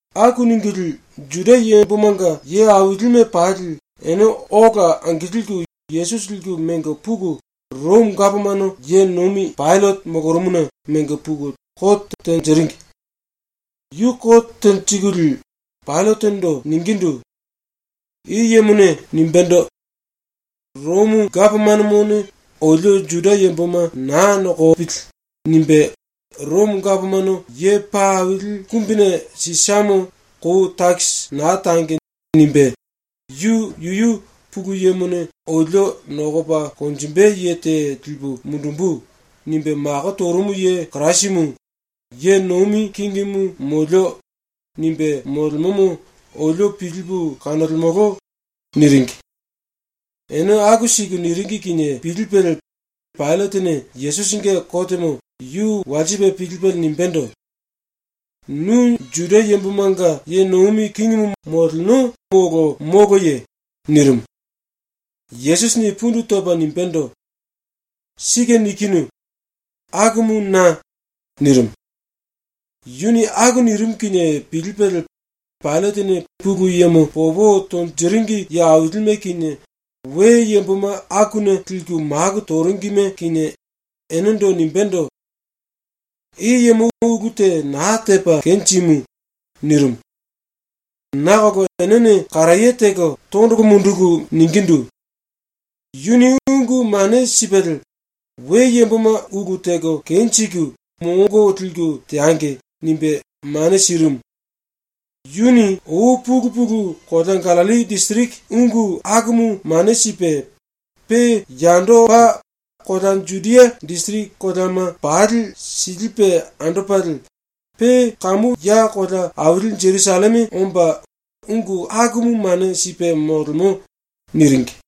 Aku ningulie Juda yambomanga ye ailime pali ene ola angilku Yesusi liku mengo puku ⸤Romo gapomano ye nomi⸥ Paillate molorumuna mengo puku kote tenjiringi. Yu kote tenjikulie Paillatendo ningindu: “I yemone nimbendo: “Romo gapomanomone olio Juda yamboma naa nokopili.” nimbe, “Romo Gapomano Ye Paa Aili Kumbine Sisamo kou takisi naa tangi.” nimbe, “Yu yuyu “Pulu Yemone olio nokopa konjimbe ye te lipu mundumbu.” nimbe mako torumu ye Kirasimu, ye nomi kingimu molio.” nimbe molemomo olio pilipu kanolemolo.” niringi. Ene aku siku niringi kinie pilipelie Paillatene ⸤Yesusinge kotemo⸥ yu walsipe pilipelie nimbendo: “Nu Juda yambomanga ye nomi kingimu molo moloye?” nirimu. Yesusini pundu topa nimbendo: “Sike nikinu. Akumu na.” nirimu. Yuni aku nirimu kinie pilipelie Paillatene Pulu Yemo popo tonjiringi ye ailime kinie, we yamboma akuna liku maku toringime kinie, enendo nimbendo: “I yemo ulu te naa tepa kenjimu.” nirimu. Nakolo enene karaye teko tondolo munduku ningindu: “Yuni ungu mane sipelie “We yamboma ulu teko kenjiku, mongo liku teangi.” nimbe mane sirimu. Yuni ou pulu pulu kolea Gallilli disiriki ungu akumu mane sipe, pe yandopa kolea Judia disiriki koleama pali silipe andopalie, pe kamu ya kolea aili Jerusalleme omba ungu akumu mane sipe molemo.” niringi.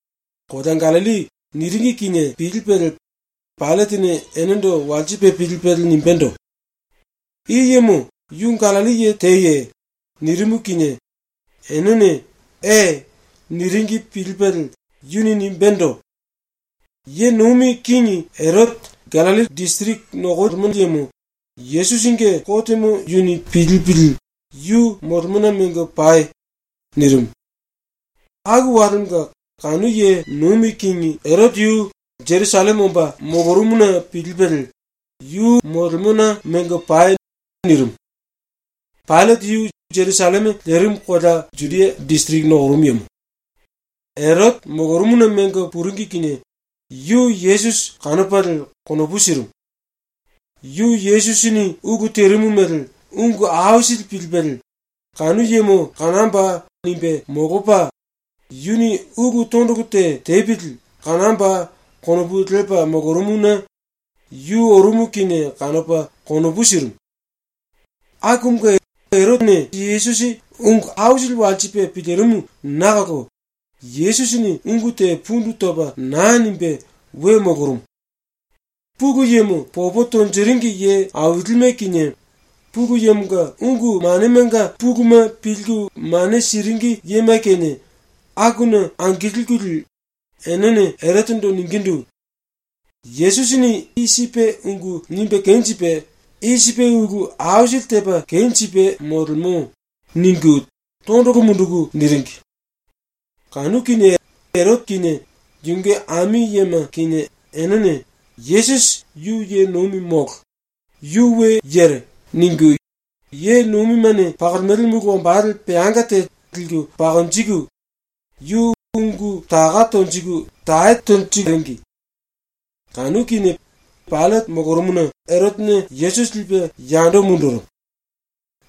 “Kolea Gallilli” niringi kinie pilipelie Paillatene enendo walsipe pilipelie nimbendo: “I yemo yu Gallilli ye teye?” nirimu kinie enene “E.” niringi pilipelie yuni nimbendo: “⸤Ye nomi kingi⸥ Erote, Gallilli disiriki nokoli yemo, Yesusinge kotemo yuni pilipili yu molemona mengo pai.” nirimu. Aku walemonga kanu ⸤ye nomi kingi⸥ Erote yu Jerusalleme omba molorumuna pilipelie, “Yu molemona mengo pai.” nirimu. ⸤Paillate yu Jerusalleme lerimu kolea Judia disiriki nokorumu yemo.⸥ Erote ⸤molorumuna mengo puringi kinie⸥ yu Yesusi kanopalie konopu sirimu. Yu Yesusini ulu terimu mele ungu aisili pilipelie, ‘Kanu yemo kanamboa!’ nimbe molopa, ‘Yuni ulu tondolo te tepili kanamboa!’ konopu lepa molorumuna yu orumu kinie kanopa konopu sirimu. Akumunge Erote Yesusi ungu aisili walsipe pilirimu nakolo Yesusini ungu te pundu topa naa nimbe we molorumu. Pulu Yemo popo tonjiringi ye ailime kinie, Pulu Yemonga ungu manemanga puluma pilku mane siringi yema kinie, akuna angilkulie enene Erotendo ningindu: “Yesusini i sipe ungu nimbe kenjipe, i sipe ulu aisili tepa kenjipe molemo.” ningu tondolo munduku niringi. Kanu kinie Erote kinie yunge ami yema kinie enene ‘Yesusi yu ye nomi molo, yu we yere.’ ningu ye nomimene pakolemele mulu wambale peanga te liku pakonjiku, yu ungu taka tonjiku tae teringi. Kanu kinie Paillate molorumuna Erotene Yesusi lipe yando mundurumu.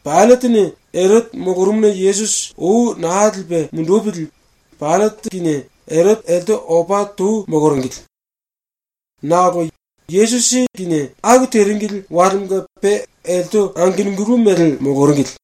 Paillatene Erote molorumuna Yesusi ou naa lipe mundupili Paillate kinie Erote elte opa tou moloringili. Nakolo Yesusi aku teringili walemonga pe elte angenungulu mele moloringili.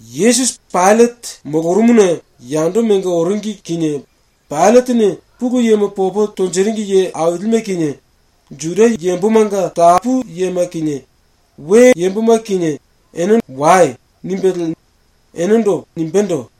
Yesusi Paillate molorumuna yando mengo oringi kinie Paillatene Pulu Yemo popo tonjiringi ye ailime kinie, Juda yambomanga tapu yema kinie, we yamboma kinie, enendo “Wai.” nimbelie nimbendo: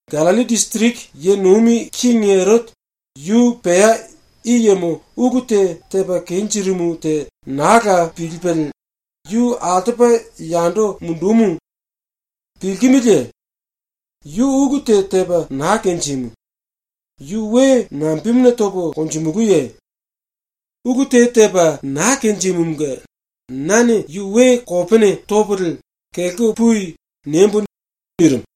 ⸤Gallilli disiriki ye nomi kingi⸥ Erote, yu pea i yemo ulu te tepa kenjirimu te naa la pilipelie yu altopa yando mundumu. Pilkimiliye? Yu ulu te tepa naa kenjimu. Yu we nambemuna topo konjimulúye? Ulu te tepa naa kenjimumunge nane yu we kopene topolie “Kelko pui.” niembo.” nirimu.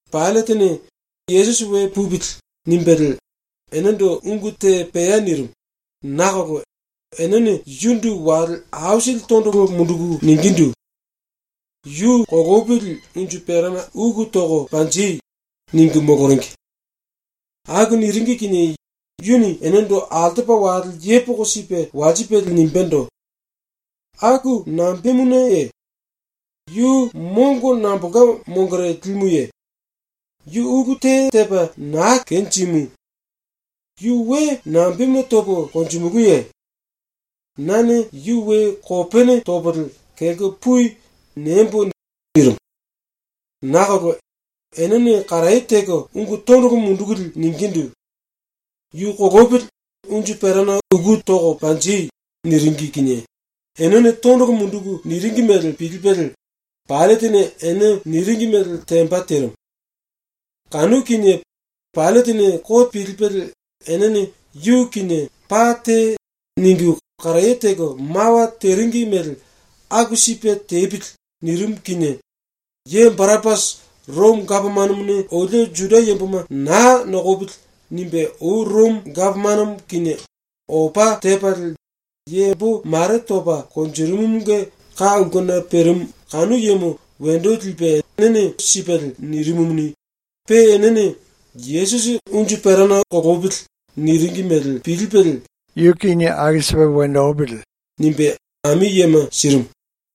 Paillatene ‘Yesusi we pupili.’ nimbelie enendo ungu te pea nirimu nakolo enene yundu wale aisili tondolo munduku ningindu: “Yu kolopili unju perana uku toko panji!” ningu moloringi. Aku niringi kinie yuni enendo altopa wale yepoko sipe walsipelie nimbendo: “Aku nambemunaye? Yu mongo nambolka mongore limuye? Yu ulu te tepa naa kenjimu. Yu we nambemuna topo konjimulúye? Nane yu we kopene topolie “Kelko pui.” niembo.” nirimu. Nakolo enene karaye teko ungu tondolo mundukulie ningindu: “Yu kolopili unju perana uku toko panji!” niringi kinie enene tondolo munduku niringi mele pilipelie Paillatene ene niringi mele temba terimu. Kanu kinie Paillatene kote pilipelie enene yu kinie “Paa tei.” ningu karaye teko mawa teringi mele ‘Aku sipe tepili.’ nirimu kinie ⸤ye Barapasi,⸥ ‘Romo gapomanomone olio Juda yamboma naa nokopili.’ nimbe ou Romo gapomanomo kinie opa tepalie yambo mare topa konjirimumunge ka ulkena perimu kanu yemo, wendo lipe ene sipelie nirimumuni, pe enene ‘Yesusi kolopili.’ niringi mele pilipelie “Yu toko konjengi.” nimbe ami yema sirimu.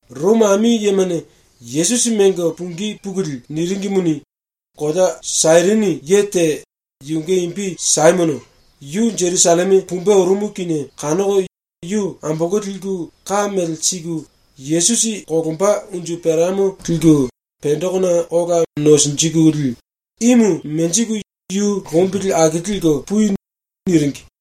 ⸤Romo ami yemane⸥ Yesusi mengo pungí pukulie niringimuni, kolea Sairini ye te, yunge imbi Saimono, yu Jerusalleme pumbe orumu kinie kanoko yu ambolko liku ka mele siku Yesusi kolomba unju peramo liku pendekona ola nosinjikulie “Imu menjiku yu lombili aki liku pui.” niringi.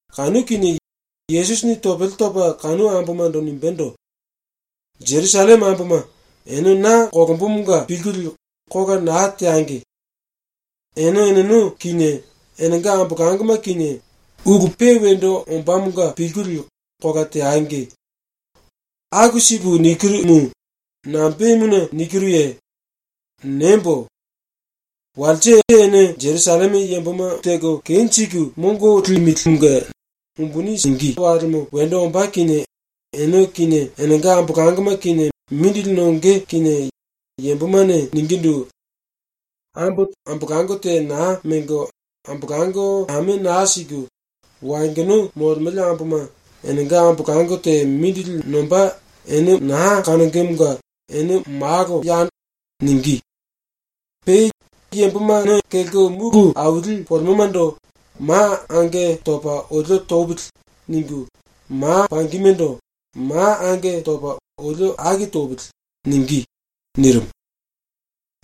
Kanu kinie Yesusini topele topa kanu ambomando nimbendo: “Jerusalleme amboma, ene na kolombomonga pilkulie kola naa teangi. Ene eneno kinie enenga ambolangoma kinie ulu pe wendo ombámonga pilkulie kola teangi. Aku sipu nikirumu, nambemuna nikiruye? Niembo: Walse ene Jerusalleme yamboma mongo simbe walemo wendo ombá kinie ene kinie enenga ambolangoma kinie mindili nonge kinie yambomane ningindu: “Ambo ambolango te naa mengo, ambolango ame naa siku, wayongono molemele amboma, enenga ambolango te mindili nomba ene naa kanongemonga ene malo.” ningí. Pe ‘yamboma kelko mulu aili polemomando “Ma ange topa olio topili.” ningu, ma pangimendo “Ma ange topa olio aki topili.” ningí.’” nirimu.⸥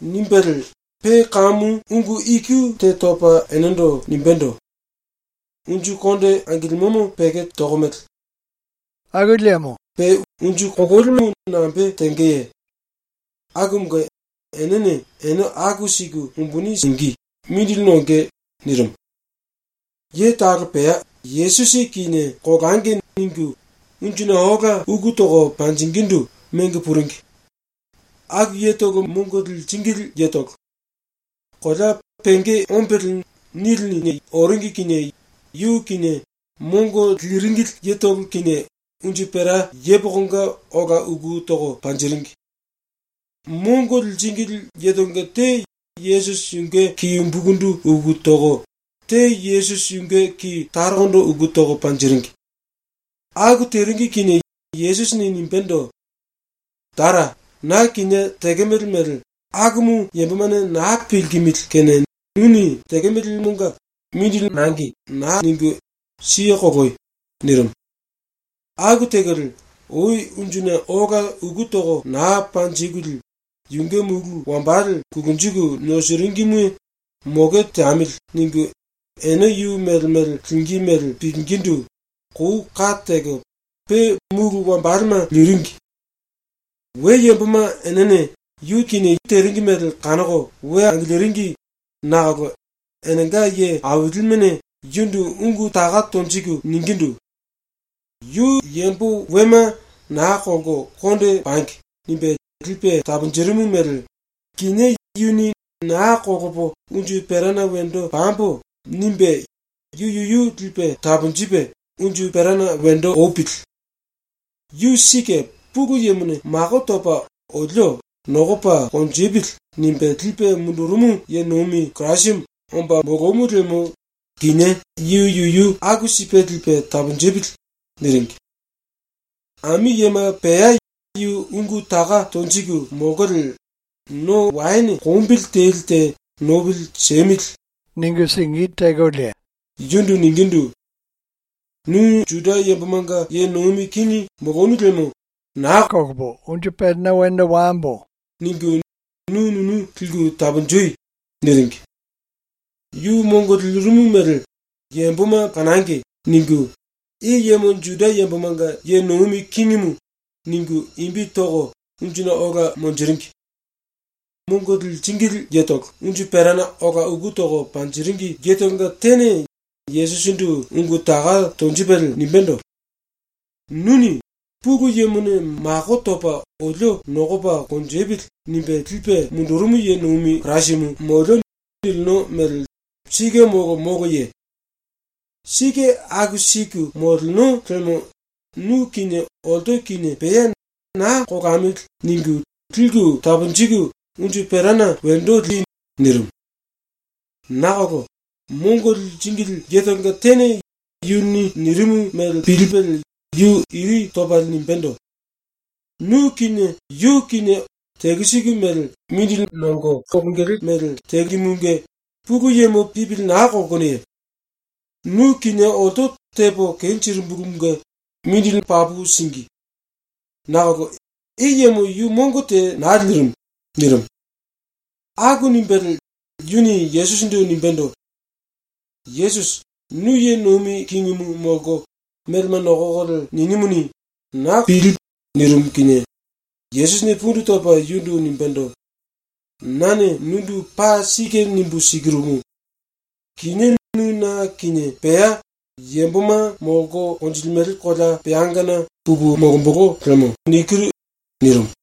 ⸤Nimbelie pe kamu ungu iku te topa enendo nimbendo:⸥ “Unju konde angilimomo peko tokomele. Pe unju kololimu nambe tengeye? Akumunge ⸤enene ene aku siku umbuni singí, mindili nonge⸥.” nirimu. Ye talo pea ‘Yesusi kinie kolangi.’ ningu unjuna ola uku toko panjingindu mengo puringi. Aku yetolo mongo liringili yetolo. Kolea ‘Penge Ombele’ niline oringi kinie yu kinie mongo liringili yetolo kinie unju pera yepokonga ola uku toko panjiringi. Mongo liringili yetolonga te Yesusi yunge ki umbukundu uku toko, te Yesusi yunge ki tarokondo uku toko panjiringi. Aku teringi kinie Yesusini nimbendo: “Tara, na kinie tekemele mele tekemele yambomane naa pilkimili kene nuni tekemelemonga mongo naa siku siye koloi.” nirimu. ⸤Aku tekolie, ou unjuna ola uku toko naa panjikulie⸥ yunge mulu wambale ⸤kulunjiku nosiringime⸥ ‘Moke teamili.’ ningu ene yu mele mele lingí mele pilingindu kou kate teko pe mulu wambalema liringi. We yamboma enene yu teringi mele kanoko we angiliringi nakolo enenga ye ailimene yundu ungu taka tonjiku ningindu: “Yu yambo wema ‘Naa kolko konde pangi.’ nimbe lipe taponjirimu mele kinié yuni ‘Naa kolopo unju perana wendo pambo.’ nimbe yu yuyu lipe taponjipe unju perana wendo opili. Yu sike Pulu Yemone mako topa olio ‘Nokopa konjipili.’ nimbe lipe mundurumu ye nomi Kirasimu omba molomu liemo kinié yu yuyu aku sipe lipe taponjipili.” niringi. Ami yema pea yu ungu taka tonjiku molkolie no waene kombili teli te ‘Nopili siemili.’ ningulie yundu ningindu: “Nu Juda yambomanga ye nomi kingi molonu liemo ‘Naa kolambo.’ ningu nu nunu liku taponji.” niringi. ‘Yu mongo lirimu mele yamboma kanangi.’ ningu I YEMO JUDA YAMBOMANGA YE NOMI KINGIMU ningu imbi toko unjuna ola monjiringi. Mongo liringili yetolo unju perana ola uku toko panjiringi yetolonga tene Yesusindu ungu taka tonjipelie nimbendo: “Nuni “Pulu Yemone mako topa olio ‘Nokopa konjipili.’ nimbe lipe mundurumu ye nomi Kirasimu ⸤molio.” nilino mele sike molo moloye? Sike aku siku⸥ moleno liemo nu kinie olto kinie pea ‘Naa kolamili.’ ningu liku taponjiku unju perana wendo li.” nirimu. Nakolo mongo liringili yetolonga tene yuni nirimu mele pilipelie yu iri topalie nimbendo: “Nu kinie yu kinie mongo telu siku mele síngimunge Pulu Yemo pipili naa kolkonoye? Nu kinie olto tepo kenjirimbulumunge mongo papu síngi. Nakolo i yemo yu mongo te naa lirimu.” nirimu. Aku nimbelie yuni ⸤Yesusindu⸥ nimbendo: “Yesusi, nu ye nomi kingimu molko melema nokokolie ninimuni, na konopu liku mundu.” nirimu kinie Yesusini pundu topa yundu nimbendo: “Nane nundu paa sike nimbu sikirumu: Kinié nu na kinie pea Yamboma Molko Konjilimele Kolea Peangana pupu molombolo lemo.” nirimu.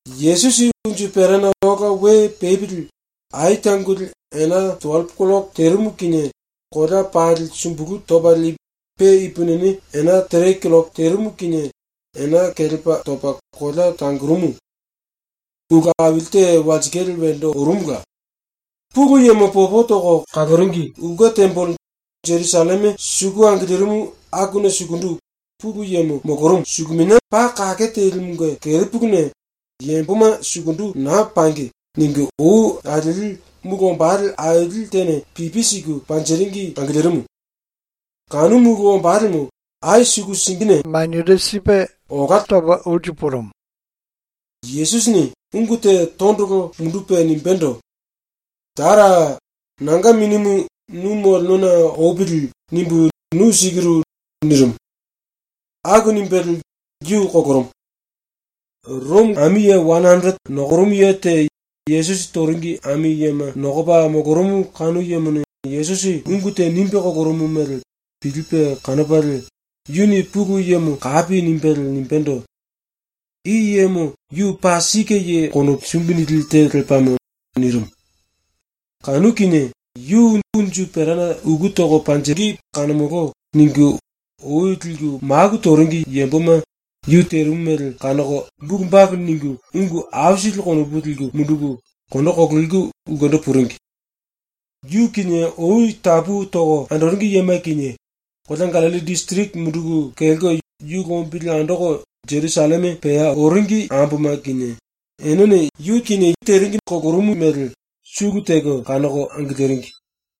Yesusi unju perana ola we pepili ai tangoli ena tuwellepo killoko terimu kinie kolea pali sumbulu topalie pe ipupini ena tere killoko kinie ena kelepa topa kolea tangorumu. ⸤Ulu aili te walsikale wendo orumula. Pulu Yemo popo toko kaloringi⸥ ulke tembele ⸤Jerusalleme suku angilirimu akuna sukundu Pulu Yemo molorumu⸥ suluminia paa kake telimunge kerepuluna ⸤‘Yamboma sukundu naa pangi.’ ningu ou alieli⸥ mulu wambale aili tene pipi siku panjiringi angilirimu. Kanu mulu wambalemo ai suku singine olá torumu. Yesusini ungu te tondolo mundupe nimbendo: “Tara, nanga minimu ‘Nu molenona opili.’ nimbu nu sikiru.” nirimu. Aku nimbelie yu kolorumu. ⸤Romo⸥ ami ye wane anderete nokorumu ye te Yesusi toringi ami yema nokopa molorumu kanu yemone Yesusi ungu te nimbe kolorumu mele pilipe kanopalie yuni Pulu Yemo kapi nimbelie nimbendo: “I yemo yu paa sike ye konopu sumbi nili te lepamo.” nirimu. Kanu kinie ‘Yu unju perana uku toko panjingí kanomolo.’ ningu ou liku maku toringi yamboma yu terimu mele kanoko bulu balu ningu ungu aisili konopu liku munduku kondo kololiku ulkendo puringi. Yu kinie ou tapu toko andoringi yema kinie, kolea Gallilli disiriki munduku kelko yu lombili andoko ⸤Jerusalleme⸥ pea oringi amboma kinie enene ⸤yu toringi kolorumu mele⸥ sulu teko kanoko angiliringi.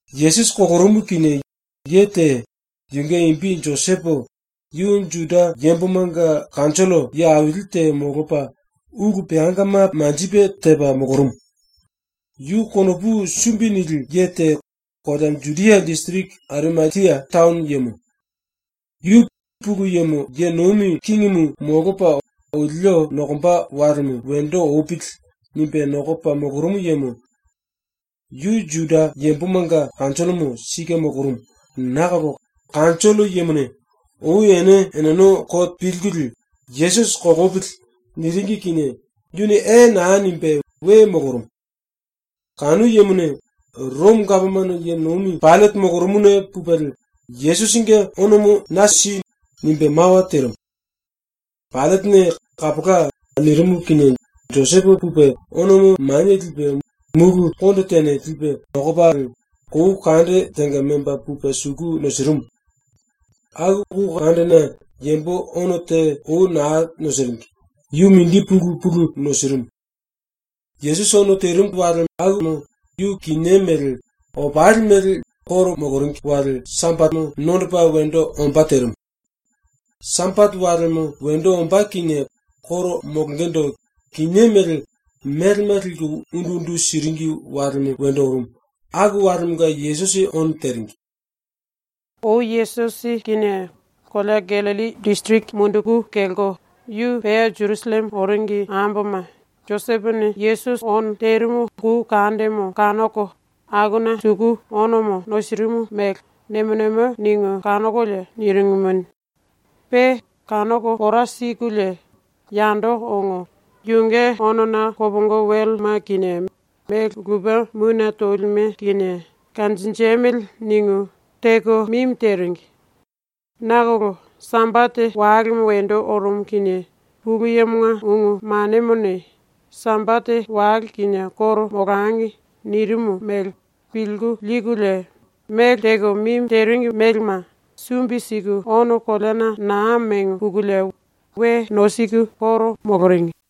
Yesusi kolorumu kinie ye te, yunge imbi Josepo, yu Juda yambomanga kanjollo ye aili te molopa, ulu peangama manjipe tepa molorumu. Yu konopu sumbi nili ye te, kolea Judia disiriki Arimatia taono yemo. Yu ‘Pulu Yemo ye nomi kingimu molopa olio nokomba walemo wendo opili.’ nimbe nokopa molorumu yemo. Yu Juda yambomanga kanjollomo sike molorumu, nakolo kanjollo yemane ⸤ou ene eneno kote pilkulie⸥ “Yesusi kolopili.” niringi kinie yuni “E.” naa nimbe we molorumu. Kanu yemone ⸤Romo gapomano ye nomi⸥ Paillate molorumuna pupelie “Yesusinge onomo na si.” nimbe mawa terimu. Paillatene “Kapola.” nirimu kinie Josepo pupe onomo manie lipe, mulu konde tene lipe kulupi topalie, kou kande tenga memba pupe suku nosirimu. Aku kou kandena yambo ono te ou naa nosiringi, yu mindi pulu pulu nosirimu. Yesusi ono terimu walemo yu kinié mele, opali mele ⸤Juda yambomanga koro moloringi⸥ wale Sambatemo nondopa wendo ombá terimu. Sambate walemo wendo ombá kinie koro molongendo kinié mele melema liku undu undu siringi walemo wendo orumu, aku walemonga Yesusi ono teringi. Ou Yesusi kinie kolea Gallilli disiriki munduku kelko yu pea ⸤Jerusalleme⸥ oringi amboma Josepone Yesusi ono terimu kou kandemo kanoko akuna suku onomo nosirimu mele nemo nemo ningu kanokolie niringimuni, pe kanoko pora sikulie yando ongo, ‘Yunge onona kopongo welema kinie mele lupe mune tolime kinie kanjinjemili.’ ningu teko mimi teringi. Nakolo Sambate walemo wendo orumu kinie Pulu Yemonga ungu manemone ‘Sambate wale kinie koro molangi.’ nirimu mele pilku likulie mele teko mimi teringi melema sumbi siku ono koleana naa mengo pukulie we nosiku koro moloringi.